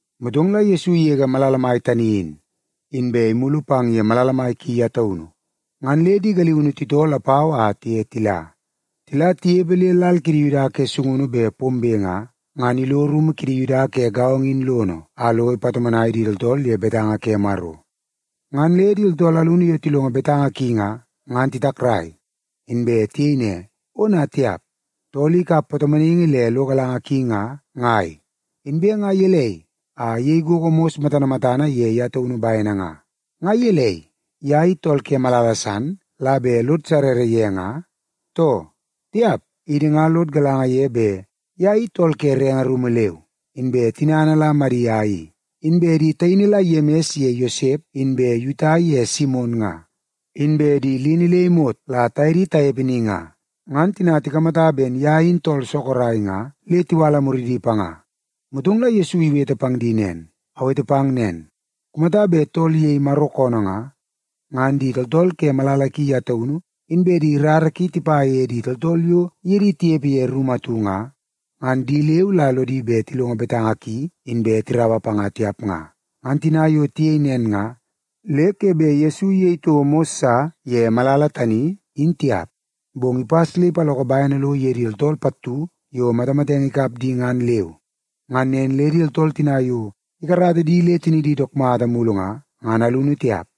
Motong la Yesu igege malala tani in, inbe imulu pang ye malala mai ki ye taunu. Ngan le di galiunu titoo lapau a tiye tila. Tila tinepe le lal kidi Yuda ke sungunu bet pombe nga, ngan ilo rumu kidi Yuda ke gaongo in lono a lo ipatomonai di tooltool ye betanga ke Maro. Ngan le di tooltool alunu yo tilongo betanga ki nga, ngan titakrai, inbe tiyei ne, “Ona tiap! Tool i ikap patomonaingi le lo galanga ki nga, ngai? Inbe nga gelei a iyei gogo mos matana matana ye ye taunu bene nga? Nga gelei, ye i tool ke malala san la bet lod sarara ye nga, too? Tiap! Idi nga lod galanga ye bet ye i tool ke renge rumu leu, inbe tinana la Madia i. Inbe di taini la Yemis ye Yosep, inbe Yuta ye Simon nga, inbe di lini le imot la taye di tanepe ni nga.” Ngan tina tikamata ben ye in tool sorok nga, le tiwala muridi panga. Motong la Yesu iwete pang di nen, “Awete pang nen, kumata bet tool iyei Maro koonoo nga, ngan di tooltool ke malala ki ye taunu, inbe di rara ki tipa ye di tooltool yo iye di tinepe ye rumu atu nga, ngan di leu la lodi bet tilongo betanga ki inbe tiraua panga tiap nga.” Ngan tina yo tiyei nen nga, le ke bet Yesu iyei toko mos sa ye malala tani, in tiap. Bong ipas le ipaloko bene lo ye di tooltool pattu yo matamatenge ikap di ngan leu. Ngan nen le di tooltool tina yo ikarata di le tinidi dook mata mulu nga, ngan alunu tiap.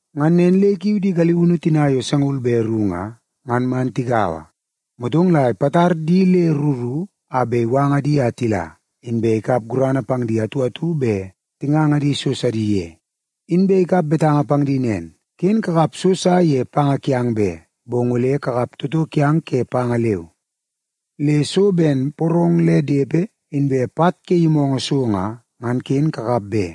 Ngan nen le ikiu di galiunu tina yo sangaul be ru nga, ngan man tigaua. Motong la ipatar di le ru ru a bet iwanga di a tila, inbe ikap gurana pang di atu atu bet tinganga di so sidi ye. Inbe ikap betanga pang di nen, “Ken kakap so sa ye panga kiang be, bong ole kakap toto kiang ke panga leu. Le so ben porong le depe, inbe pat ke yimoongoo so nga, ngan ken kakap be.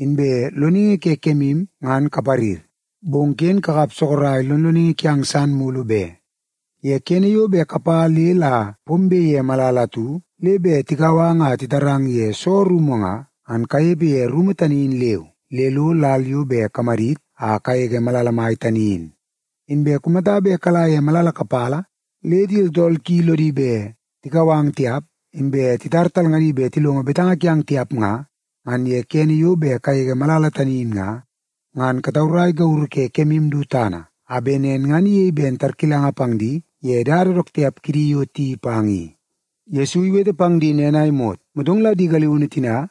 Inbe loningi ke kemu ngan kaparir, bong ken kakap sorok lonloningi kiang san mulu be. Ye kene yo bet kapa le la pombe ye malala atu, le bet tikau ang a titarang ye soo rumu nga, ngan kanepe ye rumu tani in leu, le lo lal yo bet kamadit a kagege malala mai tani in. Inbe kumata bet kala ye malala kapala le di tooltool ki lodi bet tikau ang tiap, inbe titar talngadi bet tilongo betanga kiang tiap nga, ngan ye kene yo bet kagege malala tani in nga, ngan kataurai gauru ke kemu du tana, a bet nen ngan iyei ben tarkilanga pang di ye dada dook tiap kidi yo tiyeii pang i.” Yesu iwete pang di nen a imot, motong la di galiunu tina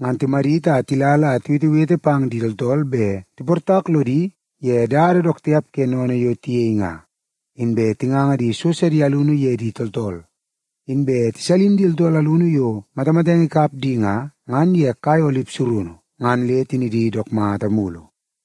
ngan timadit a tila la tiwetewete pang di tooltool bet tiportak lodi ye dada dook tiap ke sennene yo tiyei nga. Inbe tinganga di so sidi alunu ye di tooltool. Inbe tisalin di tooltool alunu yo matamatenge ikap di nga, ngan ye kai olip surunu, ngan le tinidi dook mata mulu.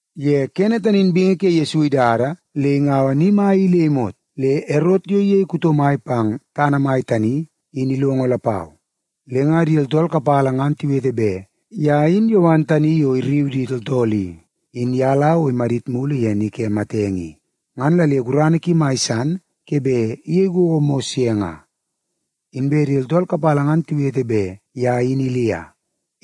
Ye kene tani in bingi ke Yesu idada le ingaua ni mai i le imot, le Erot yo iyei tool kuto mai pang tana mai tani, in ilongo lapau. Le nga di tooltool kapala ngan tiwete bet ye in Yowan tani yo irriu di tooltool i, in ye la o imadit mulu ye ni ke matenge i, ngan la le gurana ki mai san ke bet iyei gogo mos ye nga. Inbe di tooltool kapala ngan tiwete bet ye in Ilia.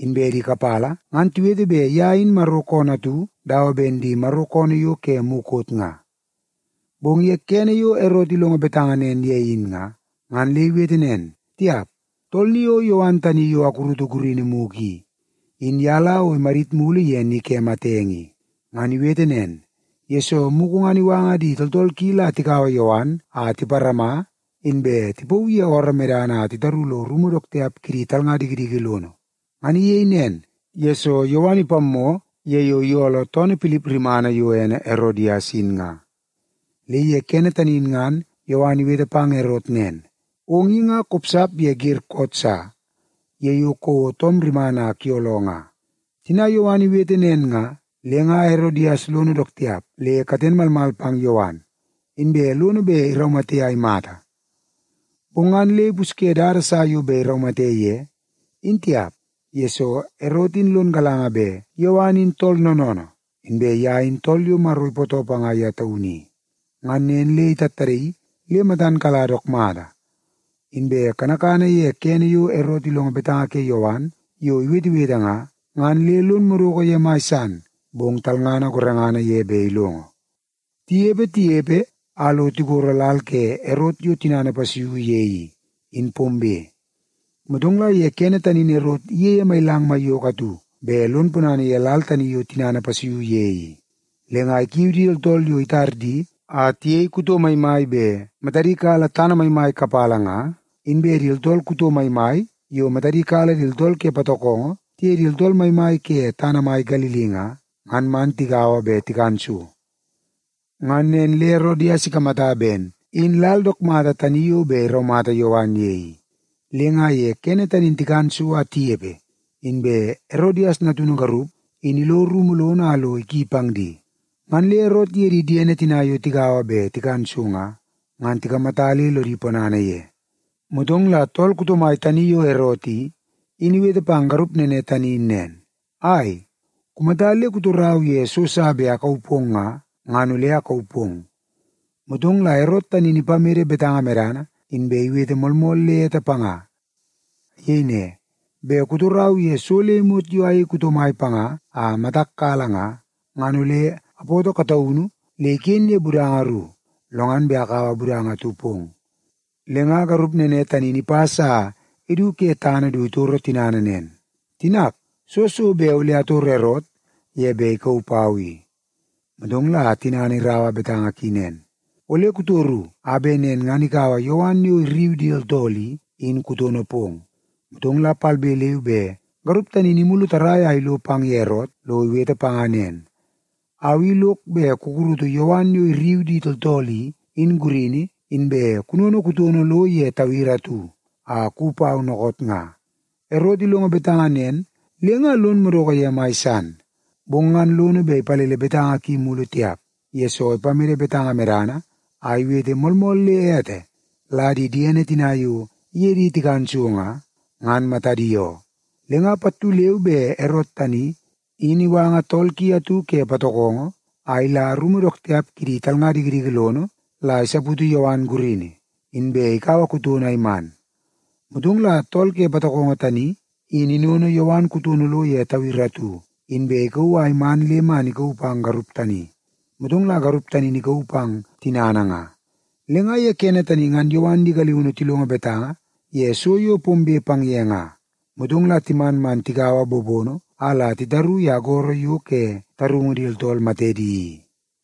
Inbe di kapala ngan tiwete bet ye in Maro koonoo atu dawa ben di Maro koonoo yo ke mukot nga. Bong ye kene yo Erot ilongo betanga nen ye in nga, ngan le iwete nen, “Tiap, tool ni o Yowan tani yo akurutu gurini mugu i, in ye la o imadit mulu ye ni ke matenge i.” Ngan iwete nen, yesoo mugu ngan iwanga di tooltool ki la tikaua Yowan a tiparama, inbe tipauu ye ooroo medana a titaru lo rumu dook tiap kidi talnga dikidiki lono. Ngan iyei nen, yesoo Yowan ipammoo ye yo iyooloo toonoo Pilip rimana yo ene Erodias in nga. Le ye kene tani in ngan Yowan iwete pang Erot nen, “Ong i nga kopsap ye wer koot sa ye yo kouo toom rimana a kuyooloo nga.” Tina Yowan iwete nen nga, le nga Erodias lono dook tiap le katen malmal pang Yowan, inbe lono bet iraumate a imata. Bong ngan le ipusye dada sa bet iraumate ye, in tiap, yesoo Erot in lon galanga bet Yowan in tool noonoonoo, inbe ye in tool yo Maro ipootoo panga ye taunu i. Ngan nen le itattadaii le matan kala dook mata. Inbe kanakana ye kene yo Erot ilongo betanga ke Yowan yo iwetewete nga, ngan le lon madoko ye mai san, bong talngana gorengana ye bet ilongo. Tinepe, tinepe, a lo tigoro lal ke Erot yo tinana ipasuiu ye i, in pombe. Motong la ye kene tani in Erot iyeie mailang maiyoko atu bet lon ponana ye lal tani yo tinana ipasuiu ye i. Le nga ikiu di tooltool yo itar di a tiyei kuto maimai bet matadi kala tana maimai kapala nga, inbe di tooltool kuto maimai yo matadi kala di tooltool ke patokongo tiye di tooltool maimai ke tana mai Galili nga, ngan man tigaua bet tikan so. Ngan nen le Erodias ikamata ben in lal dook mata tani yo bet iraumata Yowan ye i. Le nga ye kene tani in tikan so a tinepe, inbe Erodias natunu garup in ilo rumu lono a lo iki pang di. Ngan le Erot iye di diene tina yo tigaua bet tikan so nga, ngan tikamata le lodi ponana ye. Motong la tool kuto mai tani yo Erot i, in iwete pang garup nene tani in nen, “Ai, kumata le kutorau ye so sa bet akauu pong nga, ngan ole akauu pong.” Motong la Erot tani in ipamede betanga medana, inbe iwete moolmool le ete panga. Iyei ne, “Bet kutorau ye so le imot yo ayei kuto mai panga a matak kala nga, ngan ole apoto kataunu le iken ye budanga ru, lo ngan bet akaua budanga atu pong.” Le nga garup nene tani in ipas a idu ke tana du itoro tinana nen, “Tinak, soo so bet ole atoro Erot ye bet ikauu pau i?” Motong la tinana iraua betanga ki nen, “Ole kutoru a bet nen ngan ikaua Yowan yo irriu di tooltool i, in kutono pong.” Motong la palbe leu be garup tani in imulu tarrai a ilo pang ye Erot lo iwete panga nen, “Au i lok bet kukurutu Yowan yo irriu di tooltool i, in gurini, inbe kunono kutono lo ye tawiri atu a kuwi pau dookoot nga.” Erot ilongo betanga nen le nga lon madoko ye mai san. Bong ngan lono bet ipalele betanga ki mulu tiap, yesoo ipamede betanga medana a iwete moolmool le ete la di diene tina yo iye di tikan so nga, ngan matadi oo. Le nga pattu leu be Erot tani, in iwanga tool ki atu ke patokongo a ila rumu dook tiap kidi talnga dikidiki lono la isaputu Yowan gurini, inbe ikaua kutono a iman. Motong la tool ke patokongo tani in inono Yowan kutono lo ye tawiri atu, inbe ikauu a iman le man ikauu pang garup tani. Motong la garup tani in ikauu pang tinana nga. Le nga ye kene tani ngan Yowan di galiunu tilongo betanga ye so yo pombe pang ye nga, motong la timan man tikaua bobono a la titaru ye agoro yo ke tarungu di tooltool matedi i.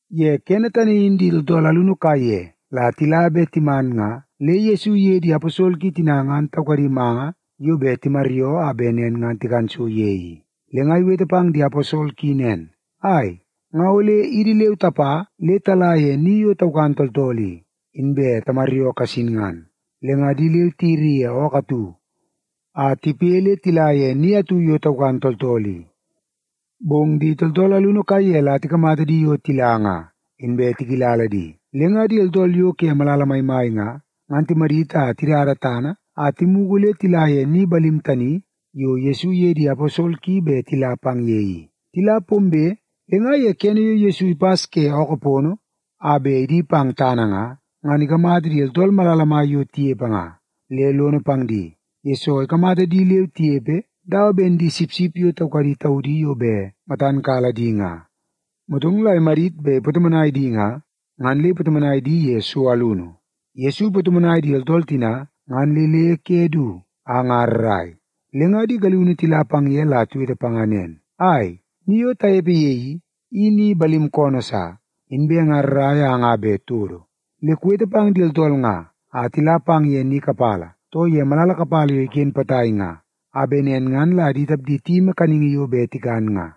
Ye kene tani in di tooltool alunu kaiye la tila be timan nga le Yesu iye di aposol ki tina ngan taukadi manga yo bet timaryoo a bet nen ngan tikan so ye i. Le nga iwete pang di aposol ki nen, “Ai, nga ole idi leu tapa le tala ye ni yo taukan tooltool i, inbe tamaryoo kasin ngan.” Le nga di leu tiyiri ye ookoo atu a tipoi le tila ye ni atu yo taukan tooltool i. Bong di tooltool alunu kaiye la tikamata di yo tila nga, inbe tikilala di. Le nga di tooltool yo ke malala maimai nga, ngan timadit a tidada tana a timugu le tila ye ni balim tani yo Yesu iye di aposol ki bet tila pang ye i. Tila pombe, le nga ye kene yo Yesu ipas ke ookoo pono a bet idi pang tana nga, ngan ikamata di tooltool malala mai yo tinepe nga, le lono pang di, yesoo ikamata di leu tinepe dawa ben di sipsip yo taukadi taudi yo bet matan kala di nga. Motong la imadit bet ipatomonai di nga, ngan le ipatomonai di ye so alunu. Yesu ipatomonai di tooltool tina ngan le le ke du a nga rrai. Le nga di galiunu tila pang ye la tiwete panga nen, “Ai, ni yo tanepe ye i, i ni balim koonoo sa, inbe nga rrai a nga bet todo. Le kuwete pang di tooltool nga a tila pang ye ni kapala, too ye malala kapala yo iken potai nga, a bet nen ngan la di tapdi tiyimi kaningi yo bet tikan nga.”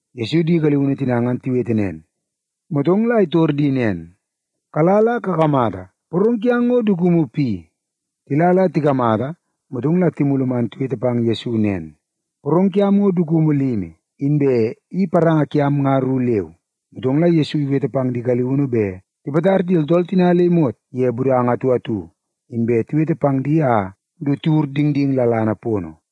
Yesu di galiunu tina ngan tiwete nen, motong la itor di nen, “Kala la kakamata, porong kiang ngo dukumu pi?” Tila la tikamata, motong la timulu man tiwete pang Yesu nen, “Porong kiam ngo dukumu limi, inbe i paranga kiam nga ru leu.” Motong la Yesu iwete pang di galiunu bet tipatar di tooltool tina le imot ye budanga atu atu, inbe tiwete pang di a du tiwur dingding lalana pono.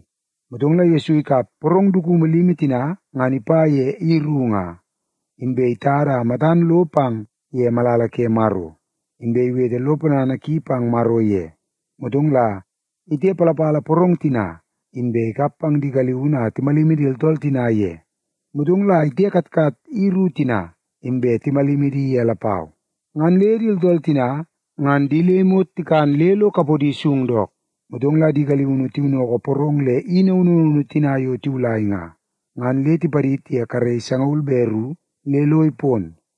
Motong la Yesu ikap porong dukumu limi tina ngan ipa ye i ru nga, inbe itada a matan lo pang ye malala ke Maro, inbe iwete lo ponana ki pang Maro ye. Motong la itepalapala porong tina, inbe ikap pang di galiunu a timalimi di tooltool tina ye. Motong la itekatkat i ru tina, inbe timalimi di ye lapau. Ngan le di tooltool tina ngan di le imot tikan le lo kapodi sung dook. Motong la di galiunu tiwinnoko porong le i naunu naunu tina yo tiwulai nga, ngan le tipadid ye karei sangaul be ru le lo ipon.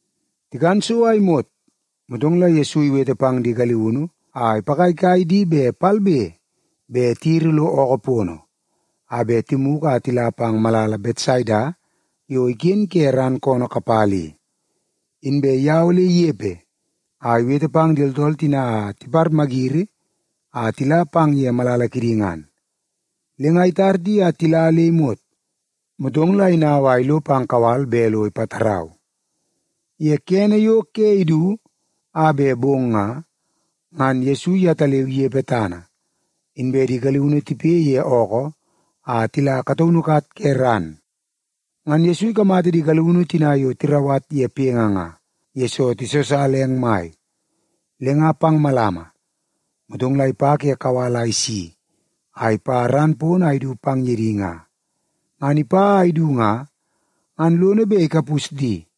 Tikan so a imot, motong la Yesu iwete pang di galiunu a ipagaigai di bet palbe be tiyiri lo ookoo pono a bet timugu a tila pang malala Betsaida yo iken ke ran koonoo kapala i. Inbe ye ole inepe a iwete pang di tooltool tina a tiparmayiri a tila pang ye malala kidi ngan. Le nga itar di a tila le imot, motong la inau a ilo pang kawal bet lo ipatarau. Ye kene yo ke idu a bet bong nga, ngan Yesu yetaleu inepe tana, inbe di galiunu tipoi ye ookoo a tila kataunu kat ke ran. Ngan Yesu ikamata di galiunu tina yo tirauwat ye poingi nga, yesoo tisosala eng mai. Le nga pang malama, motong la ipa ke kawal a isi a ipa ran pono a idu pang ye di nga. Ngan ipa a idu nga, ngan lono bet ikapus di,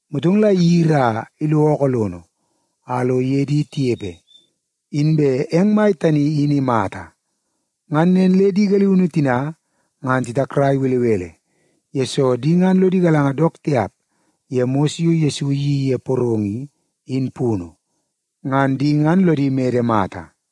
Motong la iyiri a ilo ookoo lono a lo iye di tinepe, inbe eng mai tani in imata. Ngan nen le di galiunu tina ngan titakrai belebele, yesoo di ngan lodi galanga dook tiap ye mos yo Yesu iyeii ye porong i, in punu. Ngan di ngan lodi mede mata.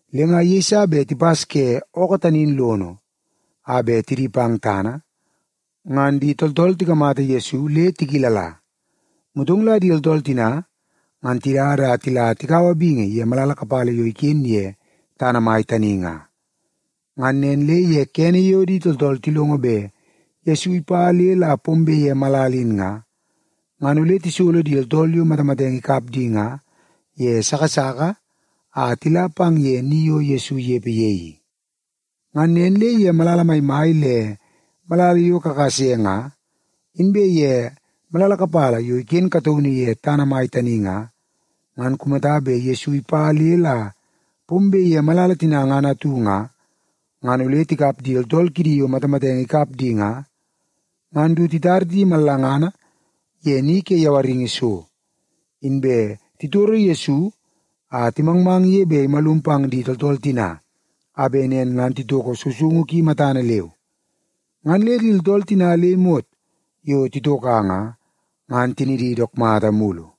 Le nga yeiso bet tipas ke ookoo tani in lono a bet tidi pang tana, ngan di tooltool tikamata Yesu le tikilala. Motong la di tooltool tina ngan tidada a tila tika bingi ye malala kapala yo iken ye tana mai tani nga. Ngan nen le ye kene yo di tooltool tilongo bet Yesu ipa le la pombe ye malala in nga, ngan ole tisolo di tooltool yo matamatenge ikap di nga ye sasaka a tila pang ye ni yo Yesu inepe ye i. Ngan nen le ye malala maimai le malala yo kakase nga, inbe ye malala kapala yo iken kataunu ye tana mai tani nga, ngan kumata bet Yesu ipa le la pombe ye malala tina ngan atu nga, ngan ole tikap di tooltool kidi yo matamatenge ikap di nga, ngan du titar di mallangana ye ni ke yawaringi so. Inbe titoro Yesu a timangmang ye bet imalum pang di tooltool tina, a bet nen ngan titoko sousoungu ki matana leu. Ngan le di tooltool tina le imot yo titoka nga, ngan tinidi dook mata mulu.